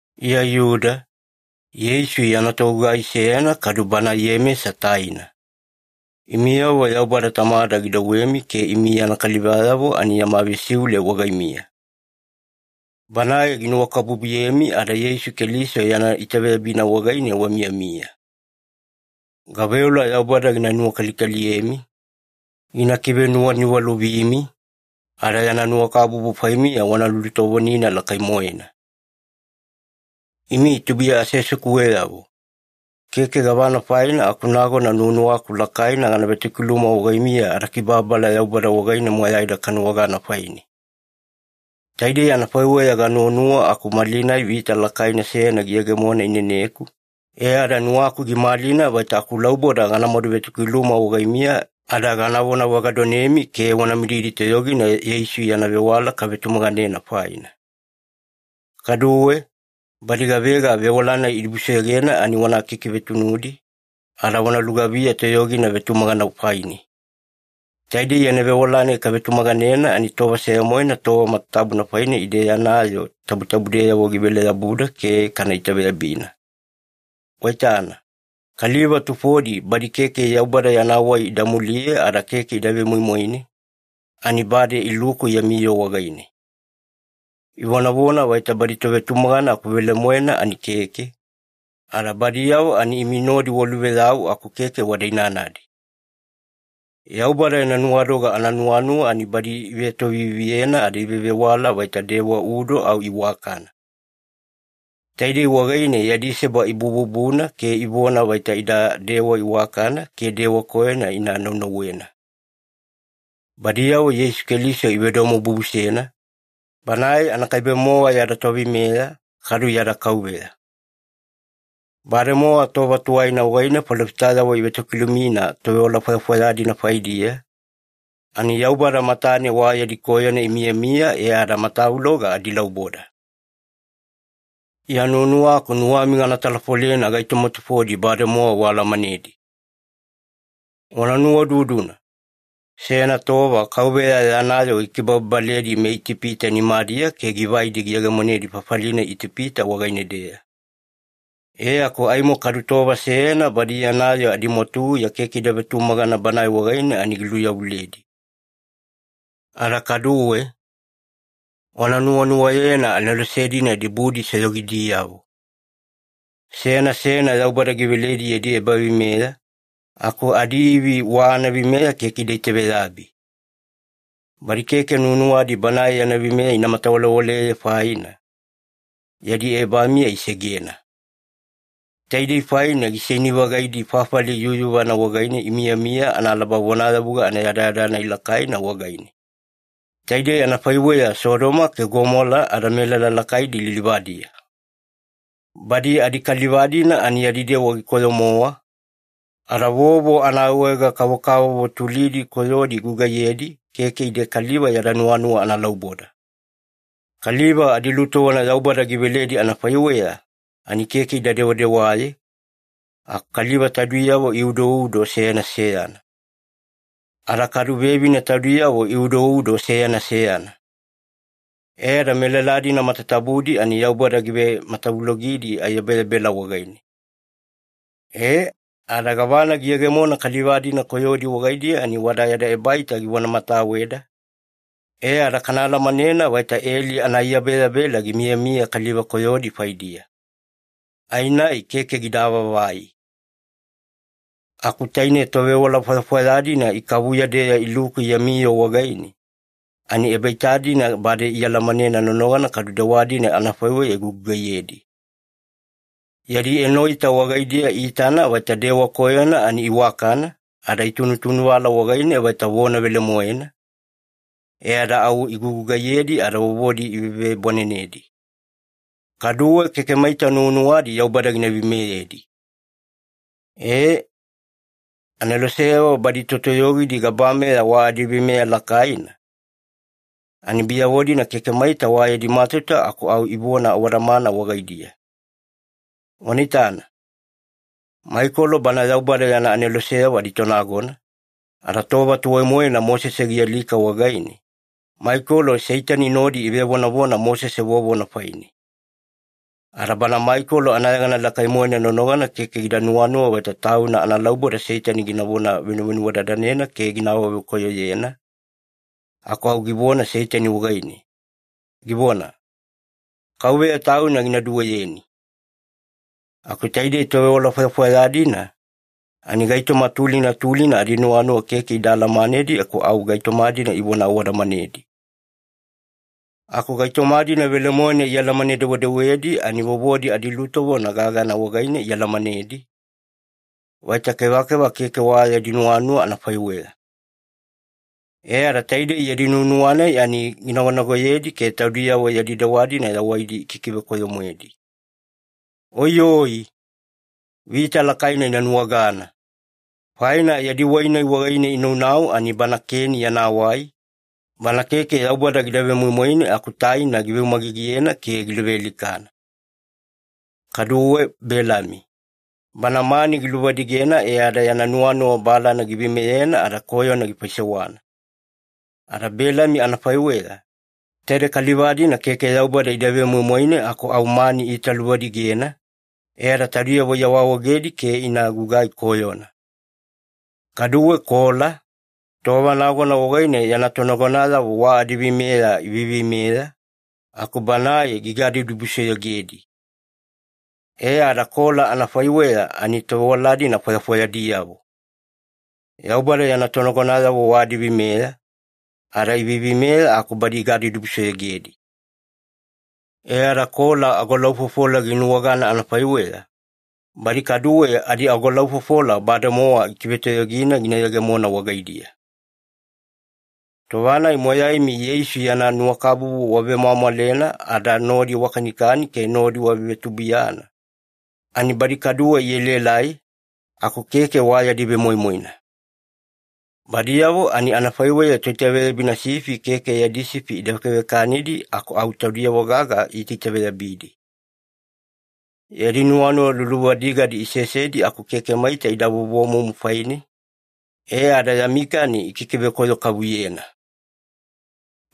Iya Iyuda, Yeisu yana togugai seyana kadu bana Iyemesa taina. Imiyavo Yaubada Tamada gidouwemi ke imi yana kalivayavo ani yama vesiule wagaimiya. Banae ginuwakabubuyemi ada Yeisu Keliso yana itaveyabina wagaine wamiyamiya. Gaveola Yaubada gina nuwakalikaliyemi, gina kivenuwaniwalovimi, ada yana nuwakabubu faimiya wana lulutovonina lakai-moena. Imi tubuiya aseasekuweyavo, keke gavana faina aku nagona nuwanuwaku lakaina gana vetokiluma wagaimiya adakibababala Yaubada wagaine moyaida kanuwagana faine. Taidei anafaiweya ganuwanuwa aku malinai vita lakaina seyana giyegemona ineneku, e ada nuwaku gimalina vaita akulauboda gana maduvetokiluma wagaimiya ada gana vonavagadonemi ke wana mididi toyogina Yeisu yana vewala kavetumaganena faina. Kaduwe, badi gavega vewala-nai idibusoyogena ani wana kikivetunudi, ada wana lugaviya toyogina vetumagana faine. Taide yana vewala-nai kavetumaganena, ani tova seya-moena tova matatabuna faine ide yana yoo tabutabudeyavo givele-yabuda ke kana itaveyabina. Waitana, kaliva tufodi badi keke Yaubada yana wai ida muliye ada keke ida vemoimoine, ani bade iluku yami yoo wagaine. Ivonavona vaita badi tovetumagana aku velemoena ani keke, ada badiyavo ani imi nodi waluveyau aku keke wada inanadi. Yaubada yana nuwadoga ananuwanuwa ani badi ivetoviviyena ada ivevewala vaita dewa udo au iwakana. Taidei wagaine yadi seba ibububuna ke ivona vaita ida iwakana ke dewa koyona ina naunauwena. Badiyavo Yeisu Keliso ivedomobubusena, Banae anakaibe-mowa yada Toveimeya kadu yada Kauveya. Bademowa tova tuwaina wagaine falofitayavo ivetokilumina tovewala fwayafwaya-dina faidiya, ani Yaubada matane wa yadi koyona imiyamiya e ada matavuloga adilauboda. Iya nuwanuwaku nuwami gana talafolena gaitoma tufodi bademowa waalamanedi. Wana nuwaududuna, seyana tova Kauveya yana yoo gikibababaledi meItipita nimadiya ke givaidi giyegemonedi fafali-nai Itipita wagaine-deya. E aku aimo kadu tova seyana badi yana yoo adimwatuguya keke ida vetumagana Banae wagaine ani giluyavuledi. Ada kaduwe, wana nuwanuwayena anelose-dina dibudisoyogidiyavo. Seyana seyana Yaubada giveledi yadi ebaveimeya, aku adiivi wa anaveimeya keke ida itaveyabi. Badi keke nuwanuwadi Banae yana veimeya ina matawalewaleye faina, yadi ebamiya isegena. Taidei faina giseini-vagaidi fafali yuyuvana wagaine imiyamiya analaba vonayavuga anayadayada-nai lakaina wagaine. Taidei anafaiweya Sodoma ke Gomola ada melala lakaidi lilivadiya. Badi adikaliva-dina ani yadi dewa gikoyo-mowa, ada vovo anaawaege-kavokavovo tulidi koyodi igugaiyedi, keke ide kaliva yada nuwanuwa analauboda. Kaliva adilutovona Yaubada giveledi anafaiweya ani keke ida dewadewaye, aku kaliva taudiyavo iudoudo seyana seyana. Ada kadu vevine taudiyavo iudoudo seyana seyana. E ada melala-dina matatabudi ani Yaubada givematavulogidi aiyabeyabela wagaine. Ee, ada gavana giyegemona kaliva-dina koyodi wagaidiya ani wada yada ebaita givonamataweda, e ada kana alamanena vaita eli ana ai yabeyabela gimiyamiya kaliva koyodi faidiya. Ai-nai keke gida avaavai. Aku taine tovewala fwayafwaya-dina ikavuya-deya iluku yami yoo wagaine, ani ebaita-dina bade ialamanena nonogana kadu dewa-dina anafaiweya igugugaiyedi. Yadi enoita wagaidiya iitana vaita dewa koyona ani iwakana, ada itunutunuvala wagaine vaita vona velemoena, e ada au igugugaiyedi ada vovodi ivevebwanenedi. Kaduwe keke maita nuwanuwadi Yaubada gina veimeyedi. Ee, aneloseyavo badi totoyogidi gabameya wa adiveimeya lakaina, ani biyavo-dina keke maita wa yadi matauta aku au ivona awadamana wagaidiya. Wana itana. Maikolo bana Yaubada yana aneloseyavo aditonagona, ada tova tuwai-moena Mosese gialika wagaine, Maikolo Seitani nodi ivevonavona Mosese vovona faine. Ada bana Maikolo anayegana lakai-moena nonogana keke gida nuwanuwa vaita tauna analauboda Seitani ginavona venuvenuwadadanena ke gina awavekoyoyena, aku au givona Seitani wagaine, givona, “Kauveya Tauna gina duweyeni.” Aku taide tovewala fwayafwaya-dina, ani gaitoma tulina tulina adinuwanuwa keke ida alamanedi aku au gaitoma-dina ivona awadamanedi. Aku gaitoma-dina velemoena ialamane-dewedewedi ani vovodi adilutovona gagana wagaine ialamanedi, vaita kevakeva keke wa yadi nuwanuwa anafaiweya. E ada taide yadi nuwanuwa-nai ani ginagonagoyedi ke taudiyavo yadi dewa-dina yawaidi ikikivekoyo-moedi. Oiyoi! Vita lakaina ina nuwagana! Faina yadi wai-nai wagaine inaunau ani bana Keni yana wai, bana keke Yaubada gida vemoimoine aku taina giveumagigiyena ke giluvealikana. Kaduwe Belami, bana mani giluvadigena e ada yana nuwanuwa balana giveimeyena ada koyona gifaisewana. Ada Belami anafaiweya, taide kaliva-dina keke Yaubada ida vemoimoine aku au mani iitaluvadigena, e ada taudiyavo iawaawaegedi ke ina gugai koyona. Kaduwe Kola, tova nagona wagaine yana tonagonayavo wa adiveimeya iveiveimeya, aku banae gigadibudibusoyogedi. E ada Kola anafaiweya ani tovewala-dina fwayafwayadiyavo. Yaubada yana tonagonayavo wa adiveimeya, ada iveiveimeya aku badi igadibudibusoyogedi. E ada Kola agolaufofola ginuwagana anafaiweya, badi kaduwe adiagolaufofola bademowa ikivetoyogina gina yegemona wagaidiya. Tova-nai moyaimi Yeisu yana nuwakabubu wavemwamwalena ada nodi wakanikani ke nodi wavevetubuiyana, ani badi kaduwe ielaelai, aku keke wa yadi vemoimoina. Badiyavo ani anafaiweya toitaveyabina sifi keke yadi sifi ida vekavekanidi aku au taudiyavo gaga iitaitaveyabidi. Yadi nuwanuwa luluvadigadi isesedi aku keke maita ida vovomumu faine, e ada yami kani ikikivekoyo-kavuyena.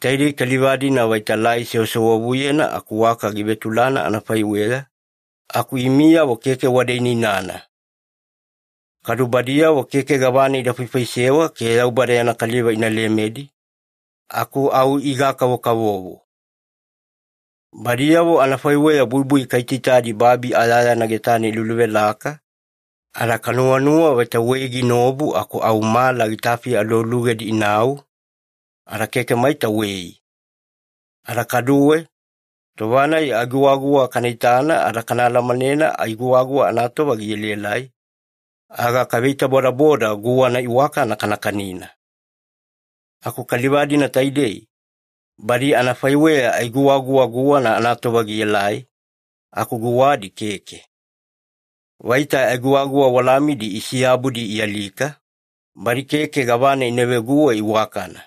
Taidei kaliva-dina vaita lai sewasewavuyena aku waka givetulana anafaiweya, aku imiyavo keke wada inainana. Kadu badiyavo keke gavana ida faifaisewa ke Yaubada yana kaliva ina lemedi, aku au iga-kavokavovo. Badiyavo anafaiweya buibui kaitaitadi babi ayayana getane iluluvelaka, ada kanuwanuwa vaita wei ginaobu aku au mala gitafi alualugedi inau, ada keke maita wei. Ada kaduwe, tova-nai ai giguwaguwa kana itana ada kaalamanena ai guwaguwa anatova gielaelai, aga kaveitabodaboda guwana iwakana kana kanina. Aku kaliva-dina taidei, badi anafaiweya ai guwaguwa guwana anatova gielai, aku guwadi keke. Vaita ai guwaguwa walamidi isiyabudi ialika, badi keke gavana ina veguwe iwakana.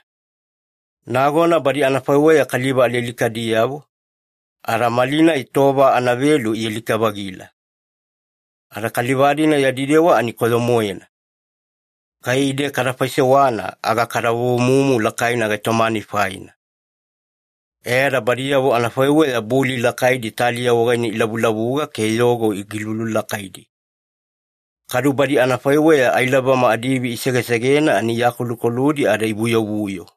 Nagona badi anafaiweya kaliva alialikadiyavo, ada malinai tova anavelu ialika-vagila. Ada kaliva-dina yadi dewa ani koyo-moena. Kai ide kada faisewana, aga kada vovomumu lakaina gaitoma-nai faina. E ada badiyavo anafaiweya buli lakaidi taliya wagaine ilavulavuga ke yogo gilululakaidi. Kadu badi anafaiweya ailabama adiivi isegesegena ani iakolukoludi ada ivuyovuyo.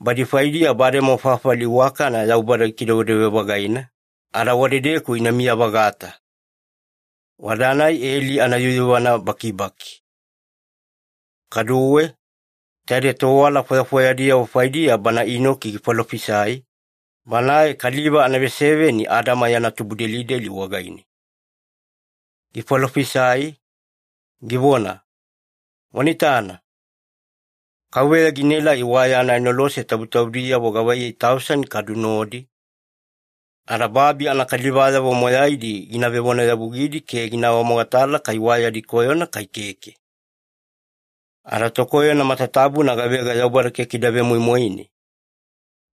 Badi faidiya bademowa fafali iwakana Yaubada gikidewedewe-vagaina, ada wadedeku inamiya-vagata. Wada-nai eli anayuyuvana bakibaki. Kaduwe, taide tovewala fwayafwayadiyavo faidiya bana Inoki gifalofisai, banae kaliva anaveseveni Adama yana tubudelideli wagaine. Gifalofisai, givona, “Wana itana! Kauveya ginaelai wa yana anelose tabutabudiyavo gavaiyei tausani kadu nodi, ada babi anakalivayavo moyaidi gina vevonayavugidi ke gina awamogatala kai wa yadi koyona kai keke. Ada tokoyona matatabuna gavega Yaubada keke ida vemoimoine,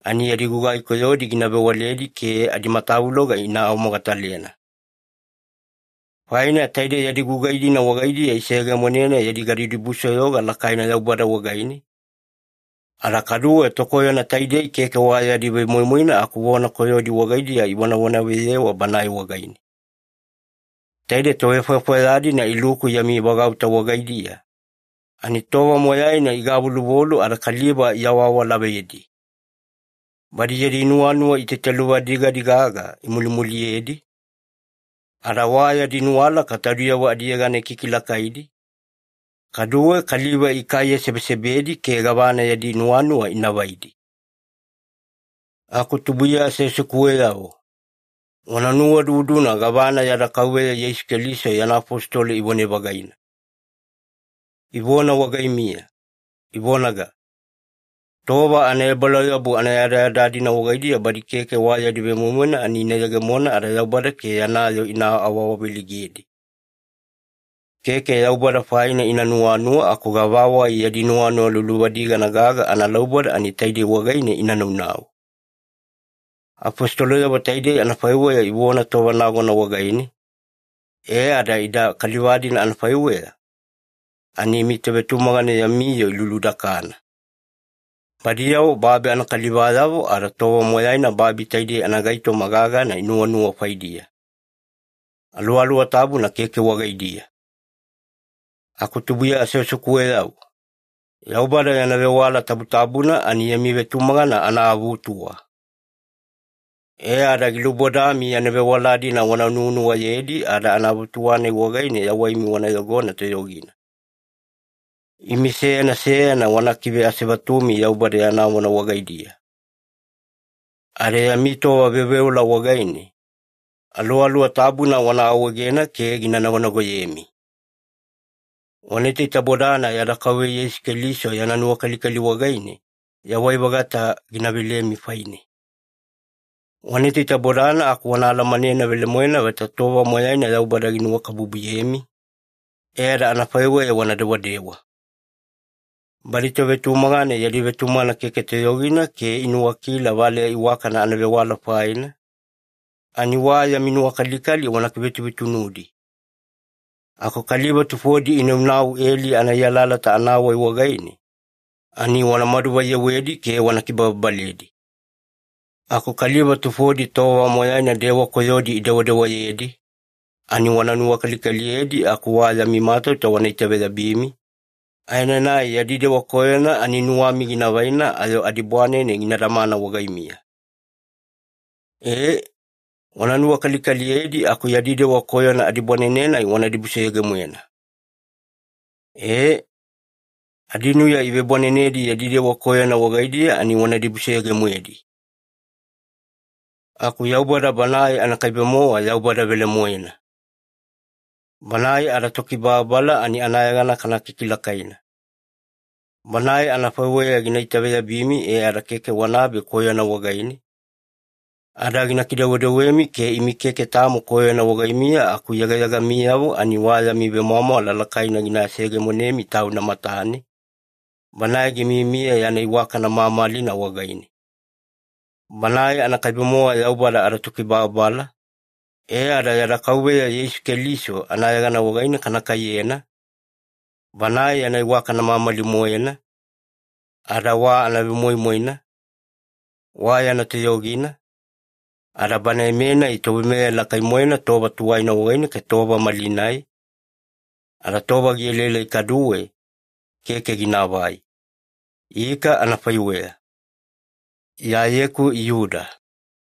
ani yadi gugai koyodi gina vewaledi ke adimatavuloga gina awamogatalena. Faina taide yadi gugai-dina wagaidiya iseyegemonena yadi gadibudibusoyoga lakaina Yaubada wagaine, ada kaduwe tokoyona taidei keke wa yadi vemoimoina aku vona koyodi wagaidiya ivonavonaveyewa Banae wagaine.” Taide tovefwayafwaya-dina iluku yami vagauta wagaidiya, ani tova moyaina igavoluvolu ada kaliva iawaawalavedi. Badi yadi nuwanuwa itaitaluvadigadi gaga imulimuliyedi, ada wa yadi nuwalaka taudiyavo adiyegana ikikilakaidi, kaduwe kaliva ikaiyesebesebedi ke gavana yadi nuwanuwa ina vaidi. Aku tubuiya aseasekuweyavo, wana nuwaududuna gavana yada Kauveya Yeisu Keliso yana afositolo ivone-vagaina. Ivona wagaimiya, ivonaga, “Tova anaebalauyabu anayadayada-dina wagaidiya badi keke wa yadi vemoimoina ani ina yegemona ada Yaubada ke yana yoo ina awaawaveleigedi. Keke Yaubada faina ina nuwanuwa, aku gavawai yadi nuwanuwa luluvadigana gaga analauboda ani taidei wagaine ina naunau.” Afositoloyavo taide anafaiweya ivona tova nagona wagaine, e ada ida kaliva-dina anafaiweya, ani imi tovetumagana yami yoo iluludakana. Badiyavo babi anakalivayavo, ada tova moyaina babi taidei anagaitoma gagana inuwanuwa faidiya. Aluwaluwa Tabuna keke wagaidiya. Aku tubuiya aseasekuweyavo, Yaubada yana vewala tabutabuna ani yami vetumagana anaavutuwa. E ada gilubodami yana vewala-dina wana nuwanuwayedi ada avutuwa-nai wagaine yawaimi wana yogona toyogina. Imi seyana seyana wana kikiveasevatumi Yaubada yana vona wagaidiya. Ada yami tova veoveola wagaine, Aluwaluwa Tabuna wana awaegena ke gina nagonagoyemi. Wana itaitabodana yada Kauveya Yeisu Keliso yana nuwakalikali wagaine yawai-vagata gina velemi faine. Wana itaitabodana aku wana alamanena velemoena vaita tova moyaina Yaubada ginuwakabubuyemi, e ada anafaiweya wana dewadewa. Badi tovetumagana yadi vetumagana keke toyogina ke inuwakila valeya iwakana anavewala faina, ani wa yami nuwakalikali wana kivetuvetunudi. Aku kaliva tufodi inaunau eli ana ai alalata anawai wagaine, ani wanamadu vaiyewedi ke wana kibababaledi. Aku kaliva tufodi tova moyaina dewa koyodi idewadewayedi, ani wana nuwakalikaliyedi aku wa yami matauta wana itaveyabimi, aenanai yadi dewa koyona ani nuwami gina vaina ayo adibwanene gina damana wagaimiya. Ee, wana nuwakalikaliyedi aku yadi dewa koyona adibwanene-nai wana dibusoyoge-moena. E, adinuya ivebwanenedi yadi dewa koyona wagaidiya ani wana dibusoyoge-moedi. Aku Yaubada Banae anakaibe-mowa Yaubada velemoena. Banae adaTokibababala ani anayegana kana kikilakaina. Banae anafaiweya gina itaveyabimi e ada keke wanabe koyona wagaine, ada gina kidewedewemi ke imi keke tamo koyona wagaimiya aku yegayegamiyavo ani wa yami vemwamwala lakaina gina seyegemonemi Tauna matane, Banae gimiyamiya yana iwakana mamalina wagaine. Banae anakaibe-mowa Yaubada adaTokibababala, e ada yada Kauveya Yeisu Keliso anayegana wagaine kana kaiyena, Banae yana iwakana mamali-moena ada wa anavemoimoina, wa yana toyogina, ada Banae-menai Toveimeya lakai-moena tova tuwaina wagaine ke tova malinai, ada tova gielaelai kaduwe, keke ginaavai. Ika anafaiweya. Iyayeku Iyuda